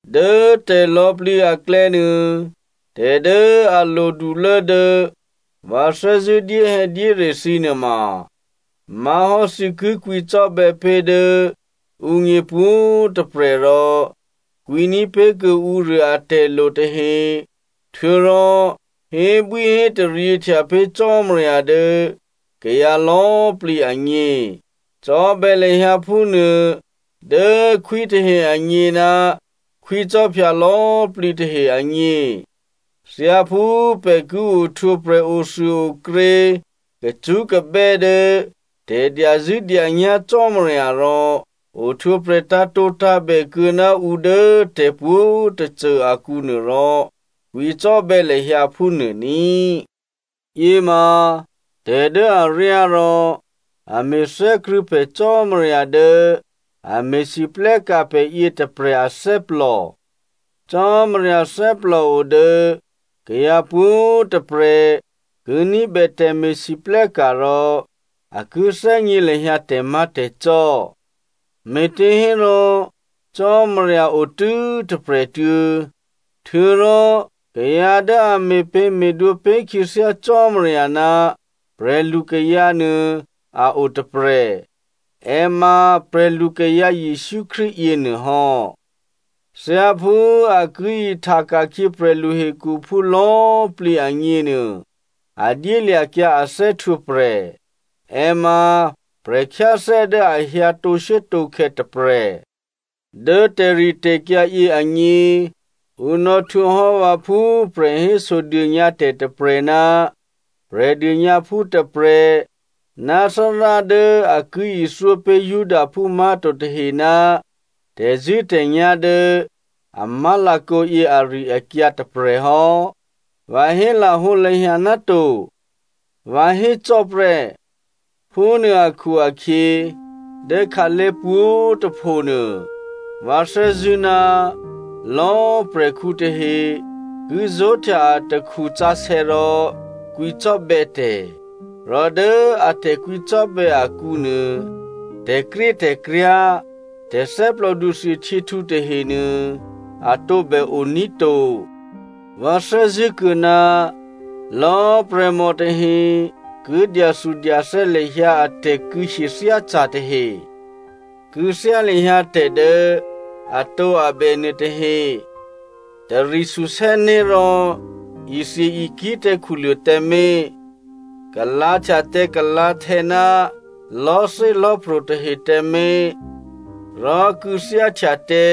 Dố tè̤lò̌꤮ plǐ aklè̌nuô tè̤dố a lodulố dố vǎ thè́zṳ̂́ dyéhè̌dyére thǐ nuôma má̤hò́ thǐ ki kwǐcò́bè̌ pé̤ dố ǔgně pwǒ̤꤮ tôprè̤, rò kwǐní̤ pé̤ kuô̌ ǔruô atè̤lo tahe, htuô̌rò hébwíhétaryěhtya pé̤ Cò́marya dố kayǎ lò̌꤮ plǐ agně. Cò́bè̌ lahyǎ phúnuô dố khwí tahe agně ná khwícò́phya lò̌꤮ plǐ tahe agně. Thyáphú pè̤ ki ohtwǒprè̤ othuôokrě kacṳ́kabè́ dố tè̤dyazṳ̂́dyanyá̤ Cò́marya rò ohtwǒprè̤ tǎ̤tǒtǎ̤bè kuô̌ ná ǔ dố tè̤pwǒ̤꤮ tôcô akǔ nuôrò, kwǐcò́bè̌ lahyǎ phúnuô ní꤮. Yěma tè̤dố aryá rò a me̤thè́krṳ̂̌ pè̤ Cò́marya dố a me̤lwóhteka̤ pè̤ yětôprè̤ athè́plò. Cò́marya thè́plòo dố kayǎ pwǒ̤꤮ tôprè̤ ki ní̤bè tè̤me̤lwóhteka̤ rò a ki thè́gně lahyǎ tè̤má̤tè̤cò́. Me̤těhérò Cò́marya otû́ tôprè̤꤮ tuô̌. Htuô̌rò kayǎ dố a me̤pě̤me̤dwǒ pé̤ khyěthyá Cò́marya ná prè̤lukayǎ nuô a o tôprè̤. È ma prè̤lukayǎ Jesǔ Krístu yěnuôhò́. Thyáphú a ki ihta ka̤khyě prè̤lu hekhuphú lò̌꤮ plǐ agněnuô a dyélya̤kyǎ a thè́htwǒprè̤. È ma prè̤khyáthè́ dố a hyǎ tǒshuốtǒkhè̌ tôprè̤. Dố tè̤ritè̤kyǎ yě agně, ǔ nò̌htwǒhò́ vǎ phú prè̤héso dônyǎtè̤ tôprè̤ ná Prè̤dônyǎphú tôprè̤ ná Thárá dố a ki ithyópé̤ Judaphú má̤to tahe ná tè̤zṳ̂́tè̤nyá̤ dố a má̤lakǒyě ari-akyǎ tôprè̤hò́. Vǎ hé lahǒlahya náto. Vǎ hécò́ prè́. Phúnuô akhu-akhyě dố khǎlé̤ pwǒ̤꤮ tôphonuô vǎ thè́zṳ̂́ ná lò̌꤮ prè̤khǔ tahe ki zó̤htya atakhu sǎsè̌ rò kwǐcò́bè̌tè̤. Rò dố a tè̤kwǐcò́bè̌ akǔnuô, tè̤krétè̤kryá̤, tè̤ thè́plòdu thuôhtyěhtǔ tahenuô a tǒbè oní̤ to. Vǎ thè́zṳ̂́kuô̌ ná lò̌ prè̤mò tahe ki dyathudyathè́ lahyǎ a tè̤kû̌hyethyáca̤ tahe. Kû̌thyá lahyǎ tè̤ dố atǒabè nuôtahe, tari susè́né̤ rò ithye-ikǐ̤ tǎ khuluô̤ tǎmé̤, kalǎ̤htya tǎ kalǎ̤htè̌ ná lò̤́thélò̤́pro̤ tahe tǎmé̤, rò kû̌thyáhtya tǎ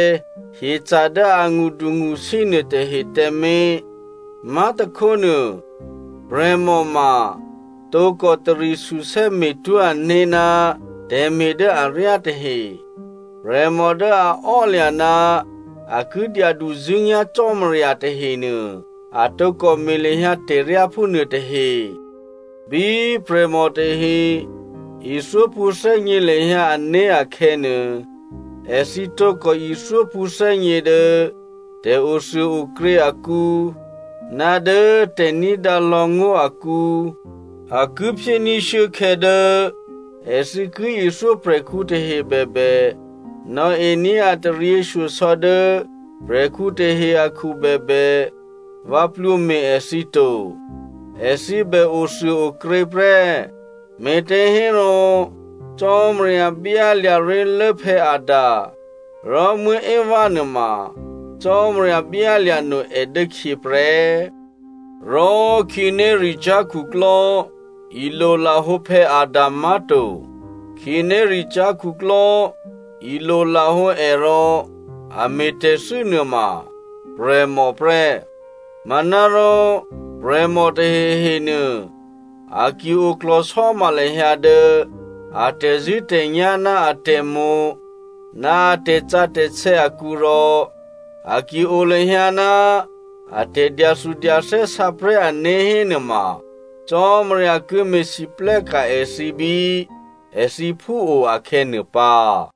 hyeca̤ dố angṳdungṳsí nuôtahe tǎmé̤. Má̤tôkhónuô, prè̤mò ma tǒkò tari susè́ me̤twó̤ ané̤ ná tè̤me̤ dố aryá tahe. Prè̤mò dố a ò́lya̤ ná a ki dyaduzṳ̂́nyá̤ Cò́marya tahenuô, a tǒkò me̤ lahyǎ tè̤ryá phúnuôtahe. Bí prè̤mò tahe ithyó pṳ̌thè́gně lahyǎ ané̤ akhè̌nuô, èthǐ tǒkò ithyó pṳ̌thè́gně dố tè̤othuôokrě akǔ ná dố tè̤ní̤dǎ lò̌ ngó̤ akǔ. A ki phyéní̤ shuốkhè̌ dố èthǐ ki ithyó prè̤khǔ tahe bèbè, nò̌ení̤ a taryěshyosò̌ dố prè̤khǔ tahe akhu bèbè, vǎ plwǒme̤ èthǐ to. Èthǐ bè othuôokrě prè́. Me̤těhérò Cò́marya byálya̤ ré̤lố Adam. Rò Eva nuôma, Cò́marya byálya̤ no è dốkhyě prè́. Rò khǐnéricyá̤ khuklò́ ilolahǒ Adam má̤to. Khǐnéricyá̤ khuklò́ ilolahǒ è rò a me̤tè̤thû́ nuôma prè̤mò prè́. Manárò prè̤mò tahehe nuô, a ki oklò̤sò́ma lahyǎ dố a tè̤zṳ̂́tè̤nyá̤ ná atè̤mo̤, ná a tè̤sǎsè̌ akǔ rò a ki o lahyǎ ná a tè̤dyathudyathè́ sǎprè̤́ ané̤ hénuôma, Cò́marya ki me̤lwóhteka̤ èthǐ bí èthǐ phúo akhè̌nuô pǎ.